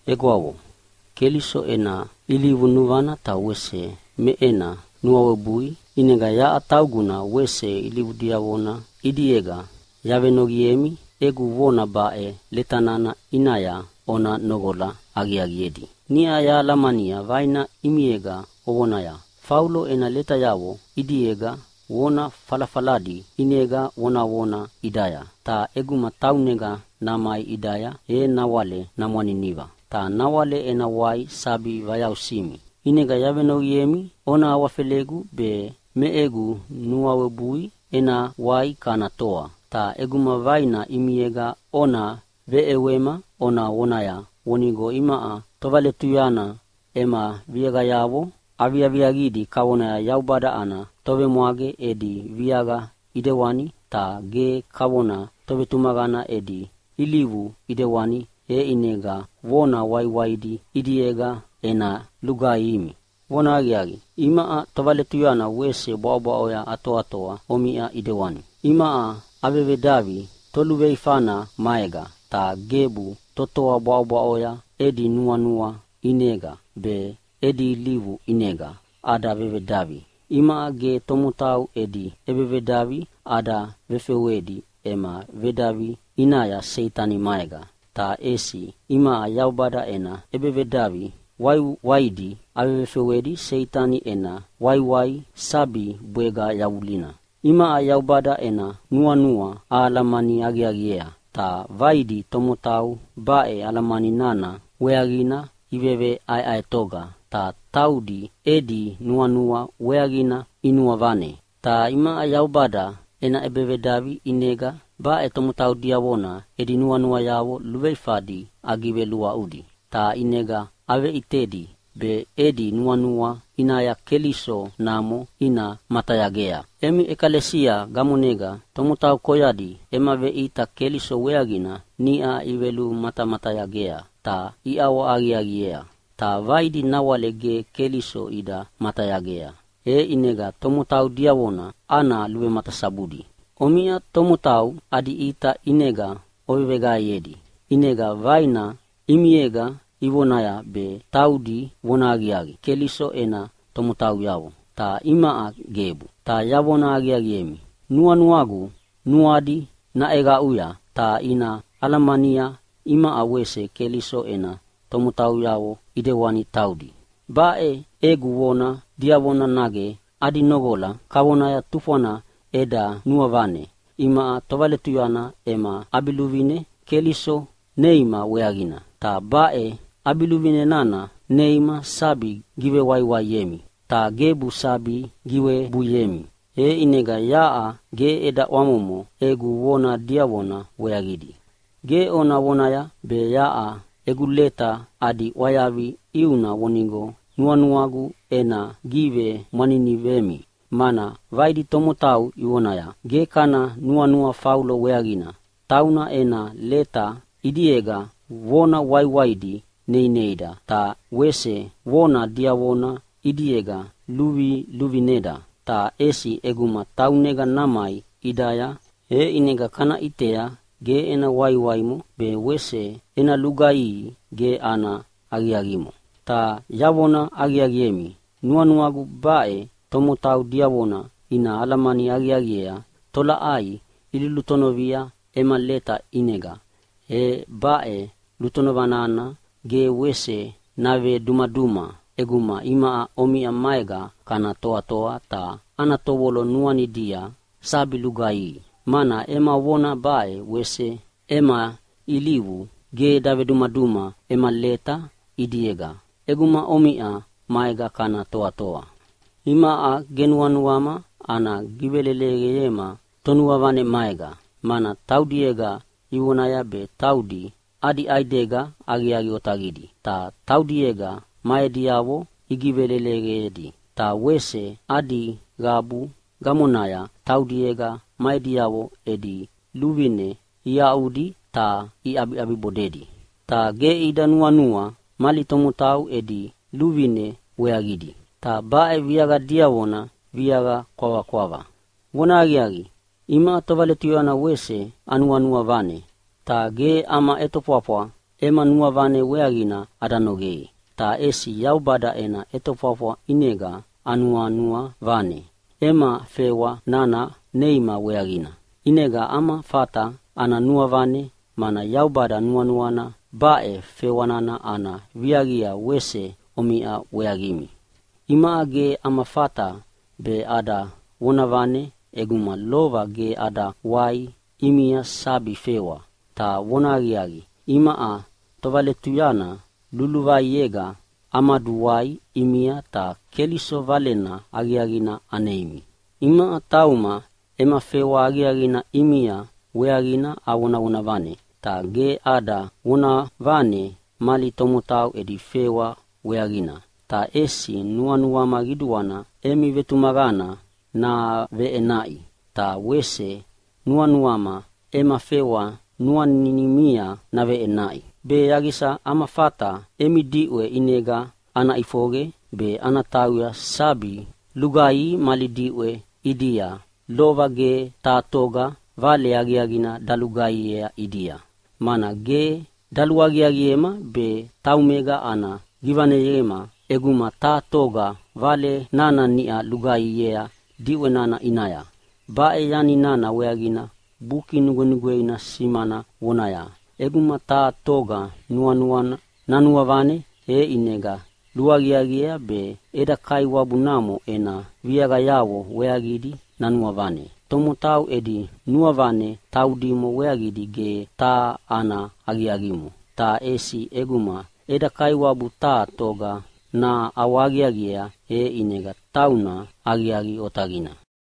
Egwavo, Keliso ena ilivu nuvana ta wese me ena nuawebui, ʼinega yaʼa tauguna wese ilivu diavona ʼidiega yavenoqiemi egu vona baʼe leta nana ʼinaya ona noqola aqiaqiedi. Niʼa yahalamania vaina ʼimiega ovonaya, “Faulo ena letayavo ʼidiega vona falafaladi ʼinega vonavona ʼidaya, ta ʼeguma taunega namai ʼidaya, e nawale namwaniniva.” Ta nawale ena wai sabi vayausimi. ʼInega yavenoqiemi, ona awafelegu be me egu nuawebui ena wai kana toa. Ta ʼeguma vaina ʼimiega ona veʼewema ona vonaya vonigo imaʼa tovaletuyana ema viaqayavo aviaviaqidi kavona Yaubada ana tovemwage edi viaqa ʼidewani, ta ge kavona tovetumaqana edi ilivu ʼidewani. E ʼinega vona waiwaidi ʼidiega ena lugaihimi. Vonahaqiaqi, imaʼa tovaletuyana wese bwaʼobwaʼoya atoatoa omiʼa ʼidewani. Imaʼa avevedavi toluveifana maega, ta gebu totoa bwaʼobwaʼo edi nuanua ʼinega be edi ilivu ʼinega ada vevedavi. Imaʼa ge tomotau edi ʼebevedavi ada vefewedi ema vedavi ʼinaya Seitani maega, ta ʼesi imaʼa Yaubada ena ʼebevedavi waiwaidi avevefewedi Seitani ena waiwai sabi bwega yavulina. Imaʼa Yaubada ena nuanua ahalamani aqiaqiea. Ta vaidi tomotau baʼe alamani nana weaqina iveʼaeʼaetoga ta taudi edi nuanua weaqina inuavane. Ta imaʼa Yaubada ena ʼebevedavi ʼinega baʼe tomotau diavona edi nuanuayavo luveifadi agiveluaʼudi, ta ʼinega aveveʼitedi be edi nuanua ʼinaya Keliso namo ina matayagea. Emi ʼekalesia gamonega tomotau koyadi ema veʼita Keliso weaqina niʼa ivelumatamatayagea ta iʼawahaqiaqiea. Ta vaidi nawale ge Keliso ida matayagea, e ʼinega tomotau diavona ana luvematasabudi. Omiʼa tomotau adi ʼita ʼinega oveveqaeyedi. ʼInega vaina ʼimiega ivonaya be taudi vonahaqiaqi Keliso ena tomotauyavo, ta imaʼa gebu. Ta yavona aqiaqiemi, nuanuagu nuadi naʼeqaʼuya ta ina alamania imaʼa wese Keliso ena tomotauyavo ʼidewani taudi. Baʼe egu vona diavona nage adi noqola kavona tufwana eda nuavane imaʼa tovaletuyana ema ʼabiluvine Keliso neima weaqina. Ta baʼe ʼabiluvine nana neima sabi givewaiwaiemi, ta gebu sabi giwebuiemi. E ʼinega yaʼa ge eda ʼwamomo egu vona diavona weaqidi. Ge ona vonaya be yaʼa egu leta adi ʼwayavi ʼiuna vonigo nuanuagu ena givemwaninivemi, mana vaidi tomotau ivonaya, “Ge kana nuanua Faulo weaqina. Tauna ena leta ʼidiega vona waiwaidi neineida ta wese vona diavona ʼidiega luviluvineda. Ta ʼesi ʼeguma taunega namai ʼidaya, e ʼinega kana ʼitea ge ena waiwaimo be wese ena lugaihi ge ana aqiaqimo!” Ta yavona aqiaqiemi, nuanuagu baʼe tomotau diavona ina alamani aqiaqiea tolaʼai ilulutonovia ema leta ʼinega, e baʼe lutonova nana ge wese navedumaduma ʼeguma imaʼa omiʼa maega kana toatoa ta ana tovolo nuanidia sabi lugaihidi. Mana ema vona be wese ema ilivu ge davedumaduma ema leta ʼidiega ʼeguma omiʼa maega kana toatoa. Imaʼa ge nuanuama ana giveleleqema tonuavane maega, mana taudiega ivonaya be taudi adi ʼaidega aqiaqi otaqidi, ta taudiega ma ediavo igiveleleqedi. Ta wese adi qabu gamonaya taudiega ma ediavo edi luvine iaʼudi ta iʼabiʼabibodedi, ta ge ida nuanua mali tomotau edi luvine weaqidi. Ta baʼe viaqa diavona viaqa kwavakwava. Vonahaqiaqi, imaʼa tovaletuyana wese anuanua vane, ta ge ama ʼetofwafwa ema nuavane weaqina ada nogei. Ta ʼesi Yaubada ena ʼetofwafwa ʼinega anuanua vane ema fewa nana neima weaqina. ʼInega ama fata ana nuavane, mana Yaubada nuanuana baʼe fewa nana ana viaqia wese omiʼa weaqimi. Imaʼa ge ama fata be ada vonavane ʼeguma lova ge ada wai ʼimia sabi fewa. Ta vonahaqiaqi, imaʼa tovaletuyana luluvaiega amaduwai ʼimia ta Keliso Valena Aqiaqina aneimi. Imaʼa tauma ema fewa aqiaqina ʼimia weaqina avonavona vane, ta ge ada vonavane mali tomotau edi fewa weaqina. Ta ʼesi nuanuama qiduana emi vetumaqana naveʼenaʼi, ta wese nuanuama ema fewa nuanimia naveʼenaʼi, be yaqisa ama fata emi diʼwe ʼinega ana ʼifoqe be ana tauya sabi lugaihi mali diʼwe ʼidia lova ge taha toga Vale Aqiaqina dalugaihiea ʼidia, mana ge daluaqiaqiema be taumega ana givaneyema ʼeguma taha toga Vale nana niʼa lugaihiea diʼwe nana ʼinaya. Baʼe yani nana weaqina Buki Nugwenugweina simana vonaya, “ʼEguma taha toga nuanuana nanuavane, e ʼinega luaqiaqiea be eda Kaiwabu namo ena viaqayavo weaqidi nanuavane.” Tomotau edi nuavane taudimo weaqidi ge taha ana aqiaqimo, ta ʼesi ʼeguma eda Kaiwabu taha toga naʼawahaqiaqiea, e ʼinega tauna aqiaqi otaqina.